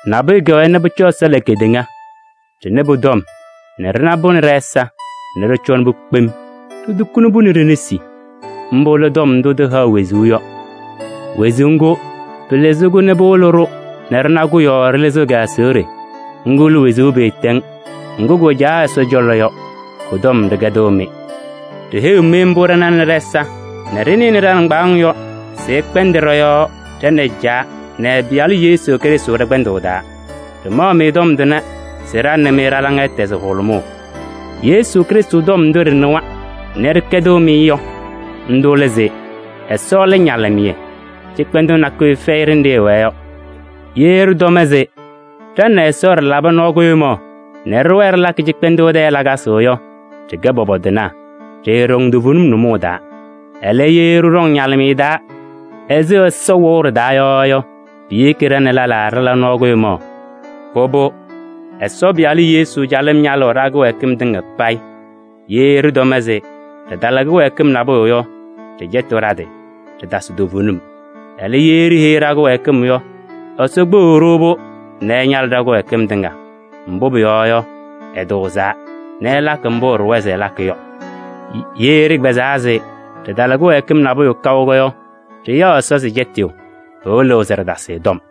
Nabʋyʋ kɛwɛɛ nɛ pʋcɔ Ɛsɔ la kedeŋa, ɖɩnɩ pʋ-tɔm nɛ ɖɩna-pʋ nɛ ɖɛ-ɛza nɛ ɖɩcɔnɩ-pʋ kpem, ɖitukuni-pʋ nɛ ɖe-nesi. Mbʋ lɛ Tɔm ndʋ tɩhaɣ wezuu yɔ. Wezuu ŋgʋ, pɩlɩzɩ-kʋ nɛ pɩwɩlɩ-ɖʋ nɛ ɖɩna-kʋ yɔɔ ɖɩlɩzɩɣ kɩ-aseɣɖe. Ŋgʋ lɛ wezuu pɩɩtɛŋ ŋgʋ kʋwɛ Caa Ɛsɔ cɔlɔ yɔ, kʋ-tɔm ɖɩkɛdɩɣ-mɩ. Ɖiheyiɣ-mɩ mbʋ ɖɩnanɩ ɖɛ-ɛza nɛ ɖɩnɩnɩ ɖa-nɩŋgbaaŋ yɔ se ɩkpɛndɩ ɖɔ-yɔɔ ɖa nɛ Caa nɛ ɛ-Pɩyalʋ Yesu Krɩstʋ ɖɛ-kpɛndʋʋ taa. Ɖɩmaɣ-mɩ tɔm tʋnɛ se ɖa nɛ mɩ ɖa-laŋa ɛtɛzɩ hʋlʋmʋʋ. Yesu Krɩstʋ tɔm ndʋ ɖɩnɩwa nɛ ɖɩkɛdɩɣ-mɩ yɔ, ndʋ lɛ se: Ɛsɔ lɛ ñalɩmɩyɛ, cɩkpɛndʋʋ nakʋyʋ fɛyɩ ɖenɖe ɛwɛɛ yɔ. Ye ɖɩtɔm se ɖa nɛ Ɛsɔ ɖɩlabɩ nɔɔ kʋɖʋmaɣ nɛ ɖɩwɛɛ ɖɩlakɩ cɩkpɛndʋʋ tɛɛ lakasɩ yɔ, ɖɩkɛ pɔpɔtɩnaa, ɖɩɩɖɔŋ toovenim nʋmɔʋ taa. Ɛlɛ, ye ɖɩɖɔŋ ñalɩmɩyɛ taa ɛzɩ Ɛsɔ wɛʋ ɖɩ-taa yɔ yɔ, piyeki nɛ ɖa nɛ lɛlaa ɖɩla nɔɔ kʋɖʋmaɣ. Pʋbʋ, Ɛsɔ Pɩyalʋ Yesu calɩm ñalɩɣ ɖa-kɩwɛɛkɩm tɩŋa payɩ. Ye ɖɩtɔm se ɖɩtala kɩwɛɛkɩm nabʋyʋ yɔ, ɖɩcɛtɩɣ ɖa-tɩ, ɖɩtasɩ toovenim. Ɛlɛ, ye ɖiheyi ɖa-kɩwɛɛkɩm yɔ, Ɛsɔ kpeɣiɣ-ɖʋ-pʋ nɛ ɛñalɩ ɖa-kɩdɛkɛdɩm tɩŋa. Mbʋ pʋyɔɔ yɔ, ɛtʋʋzaa nɛ ɛlakɩ mbʋ ɛɖʋwa se ɛlakɩ yɔ. Ye ɖɩkpɛzaa se ɖɩtala kɩwɛɛkɩm nabʋyʋ kaʋ yɔ, ɖɩyaɣ Ɛsɔ se cɛtɩyʋ, pɩwɩlɩɣ se ɖɩtasɩ ɛ-tɔm.